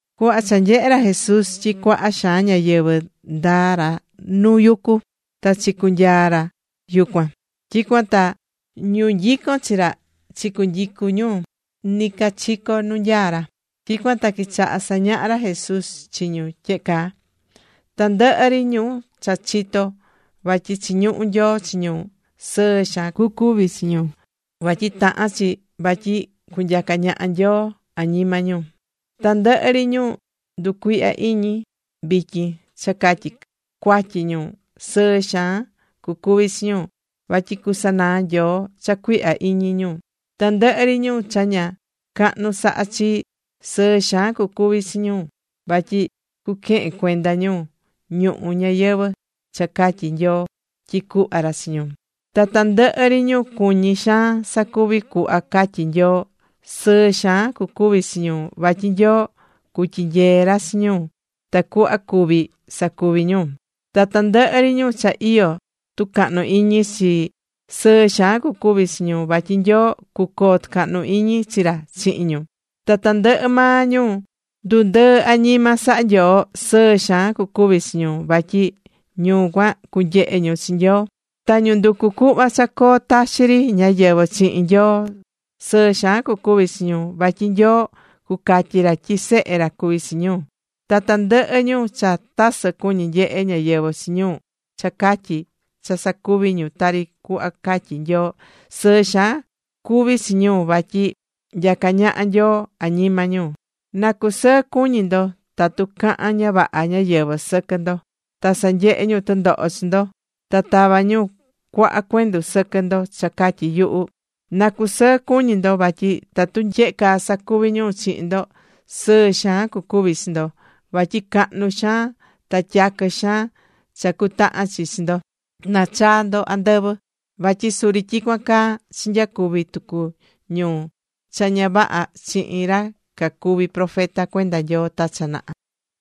Cuhva cha nyehe̱ ra Jesús tyi cuaha xaan ñáyɨvɨ, ndaa̱ ra noo nuu yucu. Ta chicunyaa̱ ra yucuan. Tyicuan ta ñu nyicón chi ra chicunyicu̱ ñu nɨcachico nu nyaá ra. Tyicuan ta quichaha̱ sañaha ra Jesús chi ñu tyehe caa: ―Tandɨhɨ ri ñu cha chitó vatyi chiñuhú Nyoo chi ñu, sɨɨ xaan cucuvi chi ñu, vatyi tahán chi vatyi cunyaca ñaha Nyoo añima ñu. ’Ta tandɨhɨ ri ñu nducuihya iñi vityin cha catyi cuatyi ñu, sɨɨ xaan cucuvi chi ñu. Vatyi cusanaa Nyoo cha cuihya iñi ñu. ’Tandɨhɨ ri ñu cha ña cahnu sahá chi, sɨɨ xaan cucuvi chi ñu, vatyi cuquehen cuenda ñu ñuhu ñayɨvɨ̱ cha catyi̱ Nyoo tyi cuhva ra chi ñu. ’Ta tandɨhɨ ri ñu cuñí xaan sacuvi cuhva catyí Nyoo, sɨɨ xaan cucuvi chi ñu, vatyi Nyoo cutyinyee ra chi ñu tacuhva cuvi sacuvi ñu. ’Ta tandɨhɨ ri ñu cha iyó tucahnu iñi chi, sɨɨ xaan cucuvi chi ñu, vatyi Nyoo, cucoo tɨcahnu iñi chi ra chihin ñu. ’Ta tandɨhɨ maa ñu ndundɨɨ̱ añima saha̱ Nyoo, sɨɨ xaan cucuvi chi ñu, vatyi ñu cuan, cunyehe ñu chi Nyoo. ’Ta ñu nducú cuhva cha coo taxi ri ñáyɨvɨ chihin Nyoo sɨɨ xaan cucuvi chi ñu, vatyi Nyoo, cucatyi ra tyi sehe ra cuví chi ñu. ’Ta tandɨhɨ ñu cha tasɨ cuñí nyehe ñáyɨvɨ chi ñu cha catyi cha sacuví ñu tari cuhva catyí Nyoo, sɨɨ xaan cuvi chi ñu, vatyi nyacá ñaha Nyoo añima ñu. ’Na cusɨɨ cuñi ndo tatu cahán ña vaha ñáyɨvɨ sɨquɨ ndo. Ta sanyehé ñu tɨndoho chi ndo. Ta tavá ñu cuaha cuendu sɨquɨ ndo cha catyi yuhu. Na cusɨɨ cuñi ndo vatyi tatu tyehe caa sacuví ñu chihin ndo, sɨɨ xaan cucuvi chi ndo, vatyi cahnu xaan ta tyaquɨ xaan cha cutahan chi chi ndo, nachaa ndo andɨvɨ. Vatyi suri tyicuan caa chinyacuvi̱ tucu ñu cha ña vaha chihin ra cacuvi̱ profeta cuenda Nyoo ta cha naha.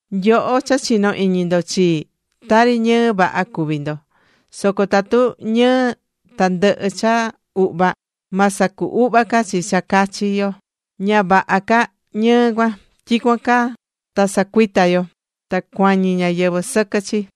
’Nyoho cha chinó iñi ndo chii, tari ñɨɨ vaha cuví ndo. Soco tatu ñɨɨ, ta ndɨhɨ cha uhva, ma sacu uhva ca chi cha cachi yo. Ña vaha ca ñɨɨ cuan. Tyicuan ta sacuita yo. Ta cuañi ñáyɨvɨ sɨquɨ chi.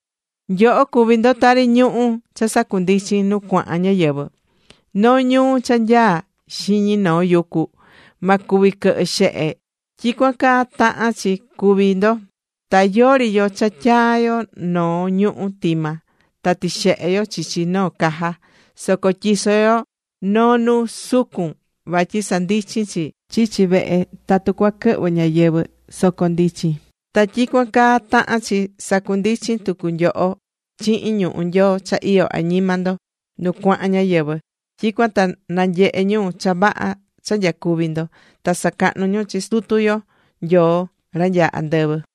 ’Nyoho cuví ndo tari ñuhu̱ cha sandundichín nu cuahan ñáyɨvɨ. Noo ñuu cha nyaá xiñi noo yucu, ma cuvi quɨhɨ xehe. Tyicuan caa tahán chi cuvi ndo. Ta yori yo cha tyaa yo noo ñuhu̱ tima, ta tixehe yo chichi noo caja. Soco tyiso yo noo nu sucun vatyi sandichin chi chichi vehe tatu cua quɨhvɨ ñáyɨvɨ, soco ndichin. Ta tyicuan caa tahán chi sandundichin tucu nyoho chihin ñuhu̱ Nyoo cha iyó añima ndo nu cuahan ñáyɨvɨ. Tyicuan ta nanyehe ñu cha vaha cha nyacuví ndo, ta sacahnu ñu chi Sutu yo Nyoo ra nyaá andɨvɨ.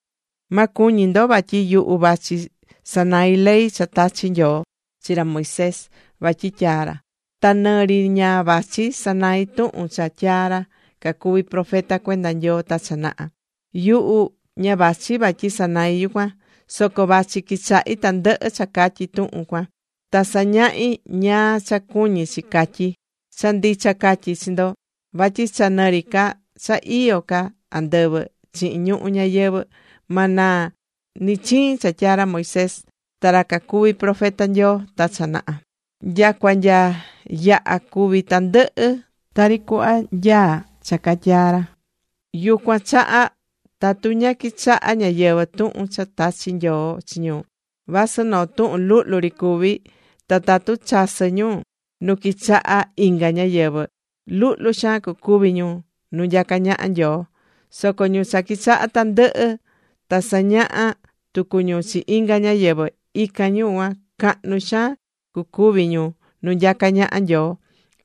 ’Ma cuñi ndo vatyi yuhu vachi sanai ley cha tachi̱ Nyoo chi ra Moisés vatyi tyaa ra. Ta nɨ ri ña vachi sanai tuhun cha tyaa̱ ra cacuvi̱ profeta cuenda Nyoo ta cha naha. Yuhu ña vachi vatyi sanai yucuan. Soco vachi quichahi tandɨhɨ cha catyí tuhun cuan, ta sañahí ñáá cha cuñí chi catyí. Cha ndicha catyí chi ndo vatyi cha nɨ ri ca cha iyó ca andɨvɨ chihin ñuhu ñayɨvɨ̱ ma naa nɨ chiin cha tyaa̱ ra Moisés ta ra cacuvi̱ profeta Nyoo ta cha naha, nyacua nya yaha cuvi tandɨhɨ tari cuhva nyaá cha catyaa̱ ra. Yucuan chaha, tatu ña quichahá ñáyɨvɨ tuhun cha tachi̱ Nyoo chi ñu, vasɨ noo tuhun luhlu ri cuví, ta tatu chasɨ ñu nu quichaha inga ñáyɨvɨ, luhlu xaan cucuvi ñu nu nyacá ñaha Nyoo. Soco ñu cha quichahá tandɨhɨ, ta sañahá tucu ñu chi inga ñáyɨvɨ. Ican ñu cuan cahnu xaan cucuvi ñu nu nyacá ñaha Nyoo.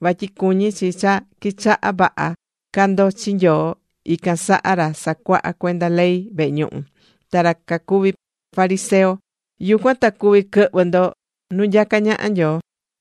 Vatyi cuñí chi cha quichahá vaha ca ndo chi Nyoo ican saha ra sacuahá cuenda ley vehe ñuhu, ta ra cacuví fariseo. Yucuan ta cuvi quɨhvɨ ndo nu nyacá ñaha Nyoo.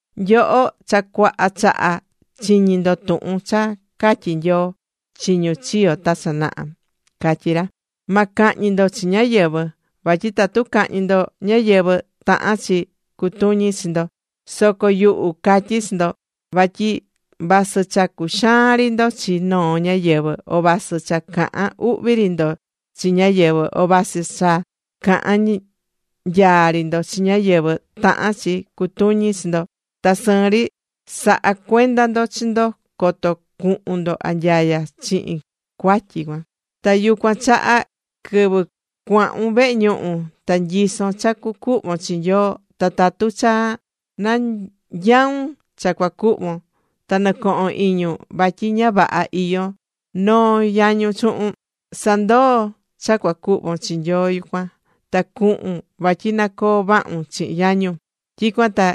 ’Nyoho cha cuaha chaha chiñi̱ ndo tuhun cha catyi̱ Nyoo chi ñu chiyo̱ ta cha naha. Catyi̱ ra: “Ma cahñi ndo chi ñáyɨvɨ, vatyi tatu cahñi ndo ñáyɨvɨ, tahán chi cutuñi chi ndo.” Soco yuhu, catyí chi ndo, vatyi vasɨ cha cuxaan ri ndo chi noo ñáyɨvɨ, o vasɨ cha cahán uhvi ri ndo chi ñáyɨvɨ, o vasɨ cha cahán nyaa ri ndo chi ñáyɨvɨ, tahán chi cutuñi chi ndo. Ta sɨɨn ri sa̱ha cuenda ndo chi ndo coto cuhun ndo anyaya chihin cuatyi cuan. ’Ta yucuan chaha quɨvɨ cuahun vehe ñuhu, ta nyisón cha cucuhvon chi Nyoo, ta tatu cha nanyaun cha cua cuhvon ta nɨcohon iñun vatyi ña vaha iyó noo yañun chuhun. Sa̱ndoo cha cua cuhvon chi Nyoo yucuan. Ta cu̱hun vatyi na coo vahun chihin yañun. Tyicuan ta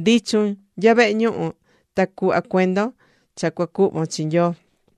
ndi̱chun nya vehe ñuhu, ta cu̱hva cuendon cha cua cuhvon chi Nyoo.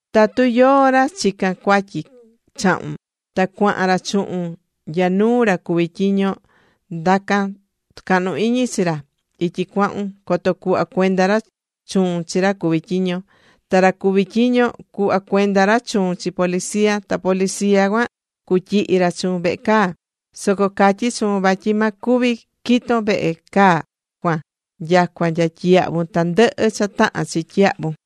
’Tatu yóó ra chicán cuatyi chahun, ta cuahan ra chuhun nya nuu ra cuví tyiño, na̱ndacan tɨcahnu iñi chi ra ityi cuahun, coto cuhva cuenda ra chuun chi ra cuví tyiño. Ta ra cuví tyiño cua cuhva cuenda ra chuun chi policía. Ta policía cuan cutyihi ra chuun vehe caa. Soco catyí chuun vatyi ma cuvi quiton vehe caa cuan nyacua nya tyiyahvun tandɨhɨ cha tahán chi tyiyahvun.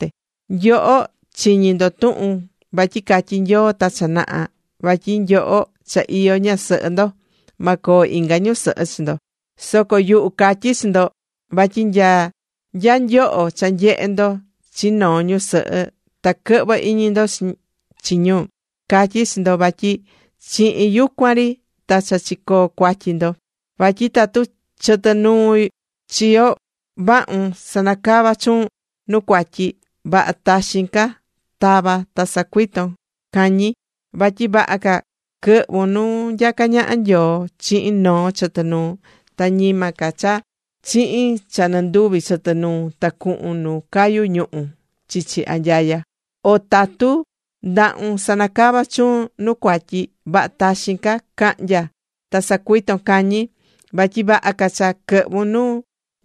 ’Nyoho chiñi̱ ndo tuhun vatyi catyi̱ Nyoo ta cha naha vatyi nyoho cha iyó ñasɨhɨ ndo, ma coo inga ñusɨhɨ chi ndo. Soco yuhu catyí chi ndo, vatyi nya nyoho cha nyehé ndo chi noo ñusɨhɨ ta quɨhvɨ iñi ndo chi ñu, catyí chi ndo vatyi chihin yucuan ri ta cha chicoo̱ cuatyi ndo. ’Vatyi tatu chɨtɨ nuu chiyo vahun sanacavá chuun nu cuatyi, vaha taxin ca ta̱va ta sa̱cuiton cañi. Vatyi vaha ca quɨhvun nu nyacá ñaha Nyoo chihin noo chɨtɨ nuun, ta ñima ca chihin cha nɨnduvi chɨtɨ nuun ta cuhun nu cayu ñuhu̱ chichi anyaya. O tatu ndahun sanacavá chuun nu cuatyi, vaha taxin ca ca̱hnya ta sa̱cuiton cañi. Vatyi vaha ca cha quɨhvun nu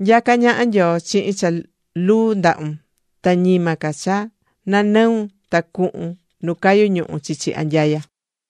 nyacá ñaha Nyoo chihin cha luu ndahun, ta ñima ca cha nanɨun ta cuhun nu cayu ñuhu̱ chichi anyaya.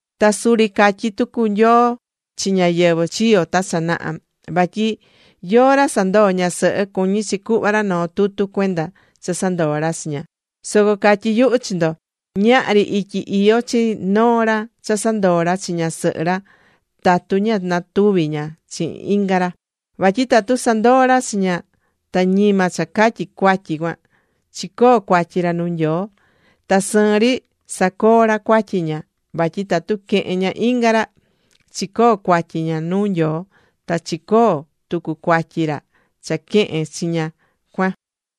’Ta suri catyi̱ tucu Nyoo chi ñáyɨvɨ chiyo̱ ta cha naha vatyi yóó ra sandoo̱ ñasɨhɨ, cuñí chi cuhva ra noo tutu cuenda cha sandoo̱ ra chi ña. Soco catyí yuhu chi ndo, ñahri ityi iyó chi noo ra cha sandoo ra chi ñasɨhɨ ra tatu ña natuvi̱ ña chihin inga rayɨɨ. Vatyi tatu sandoo̱ ra chi ña, ta ñima cha catyi cuatyi cuan, chicoo̱ cuatyi ra nuu Nyoo. Ta sɨɨn ri sacoo̱ ra cuatyi ña vatyi tatu quehen ña inga ra, chicoo̱ cuatyi ña nuu Nyoo. Ta chicoo̱ tucu cuatyi ra cha quehe̱n chi ña cuan.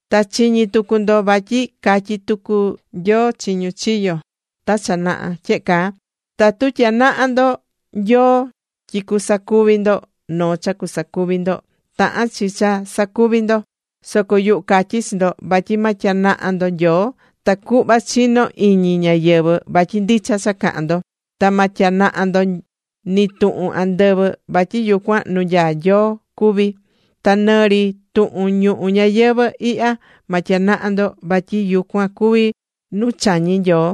’Ta chiñi̱ tucu ndo, vatyi catyi̱ tucu Nyoo chi ñu chiyo̱ ta cha naha tyehe caa: “Tatu tyanaha ndo Nyoo tyi cusacuvi ndo noo cha cusacuvi ndo, tahan chi cha sacuvi ndo.” Soco yuhu catyí chi ndo vatyi ma tyanaha ndo Nyoo tacuhva chino iñi ñáyɨvɨ vatyi ndicha cha cahán ndo. Ta ma tyanaha ndo ni tuhun andɨvɨ, vatyi yucuan nu nyaá maa Nyoo cuví. Ta nɨ ri tuhun ñuhu ñayɨvɨ̱ ihya ma tyanaha ndo, vatyi yucuan cuví nu chañí Nyoo.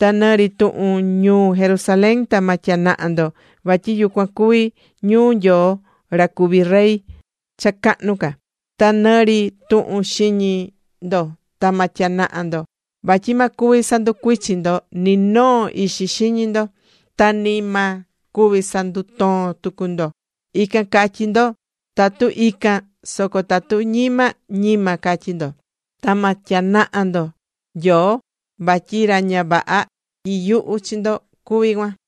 Ta nɨ ri tuhun ñuu Jerusalén, ta ma tyanaha ndo, vatyi yucuan cuví ñuu Nyoo ra cuví Rey cha cahnu ca. Ta nɨ ri tuhun xiñi ndo, ta ma tyanaha ndo, vatyi ma cuvi sanducuichin ndo ni noo ixi xiñi ndo. Ta ni ma cuvi sandutoon tucu ndo. “Ican” ca̱tyi ndo, tatu ican. Soco tatu ñima, “ñima”, ca̱tyi ndo. Ta ma tyanaha ndo Nyoo vatyi ra ña vaha tyiyuhú chi ndo cuví cuan.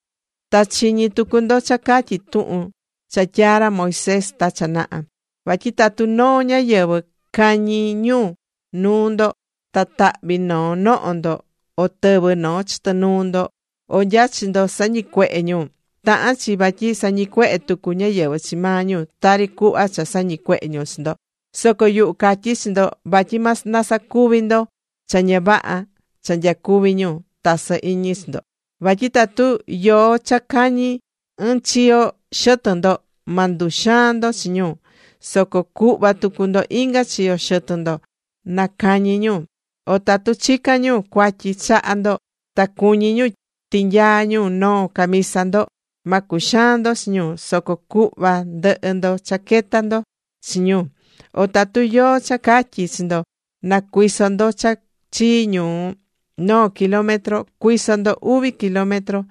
’Ta chiñi̱ tucu ndo cha catyí tuhun cha tyaa̱ ra Moisés ta cha naha: “Vatyi tatu noo ñáyɨvɨ cañi ñu nuu ndo, ta tahvi noo noho ndo, o tɨvɨ noo chɨtɨ nuu ndo, o nya chi ndo sañicuehe̱ ñu, tahán chi vatyi sañicuehe tucu ñáyɨvɨ chi maa ñu, tari cuhva cha sañicuehe̱ ñu chi ndo.” Soco yuhu catyí chi ndo, vatyi ma nasacuvi ndo cha ña vaha cha nyacuvi̱ ñu tasɨ iñi chi ndo. Vatyi tatu yóó cha cañi ɨɨn chiyo xɨtɨn ndo, ma nduxaan ndo chi ñu. Soco cuhva tucu ndo inga chiyo xɨtɨn ndo na cañi ñu. O tatu chicán ñu cuatyi chaha ndo, ta cuñí ñu tinyaa ñu noo camisa ndo, ma cuxaan ndo chi ñu. Soco cuhva ndɨhɨ ndo chaqueta ndo chi ñu. O tatu yóó cha catyí chi ndo na cuiso ndo cha chii ñu noo kilómetro, cuiso ndo uvi kilómetro.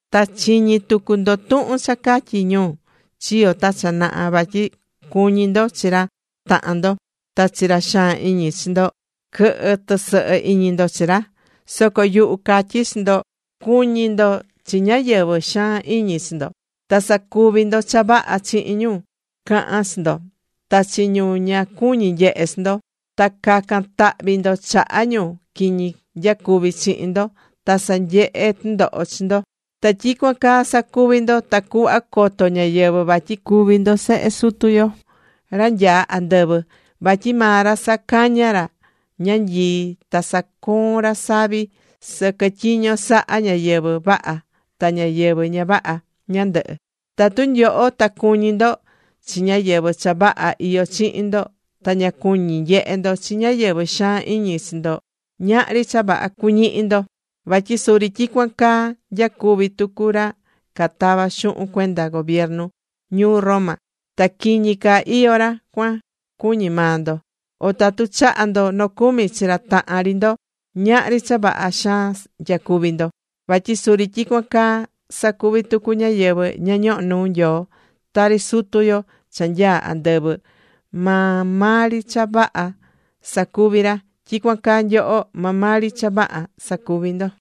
’Ta chiñi̱ tucu ndo tuhun cha catyi̱ ñu chiyo̱ ta cha naha vatyi cu̱ñi ndo chi ra tahan ndo. Ta chi ra xaan iñi chi ndo quɨ̱hɨ tɨsɨhɨ iñi ndo chi ra. Soco yuhu catyí chi ndo, cu̱ñi ndo chi ñáyɨvɨ xaan iñi chi ndo. Ta sa̱cuvi ndo cha vaha chihin ñáyɨvɨ cahan chi ndo, ta chi ñu ña cuñí nyehe chi ndo. Ta ca̱can tahvi ndo chaha ñu quiñi nyacuvi chihin ndo ta sanyehé tɨndoho chi ndo. Ta tyicuan caa sa̱cuvi ndo tacuhva coto ñáyɨvɨ vatyi cuví ndo sehe Sutu yo ra nyaá andɨvɨ. Vatyi maa ra sacañá ra ñanyii, ta sacoón ra savi sɨquɨ tyiño sahá ñáyɨvɨ vaha ta ñáyɨvɨ ña vaha ñandɨhɨ. Tatu nyoho ta cuñí ndo chi ñáyɨvɨ cha vaha iyó chihin ndo ta ña cuñí nyehe ndo chi ñáyɨvɨ xaan iñi chi ndo, ñahri cha vaha cuñihi ndo. Vatyi suri tyicuan caa nyacuví tucu ra catavá xuhun cuenda gobiernu ñuu Roma. Ta quiñi ca iyó ra cuan cuñí maa ndo. O tatu chahá ndo nocumi chi ra tahan ri ndo, ñahri cha vaha xaan nyacuví ndo. Vatyi suri tyicuan caa sacuví tucu ñáyɨvɨ ña ñohó nuu Nyoo. Tari Sutu yo cha nyaá andɨvɨ maa maa ri cha vaha sacuví ra, tyicuan caa nyoho maa maa ri cha vaha sa̱cuvi ndo.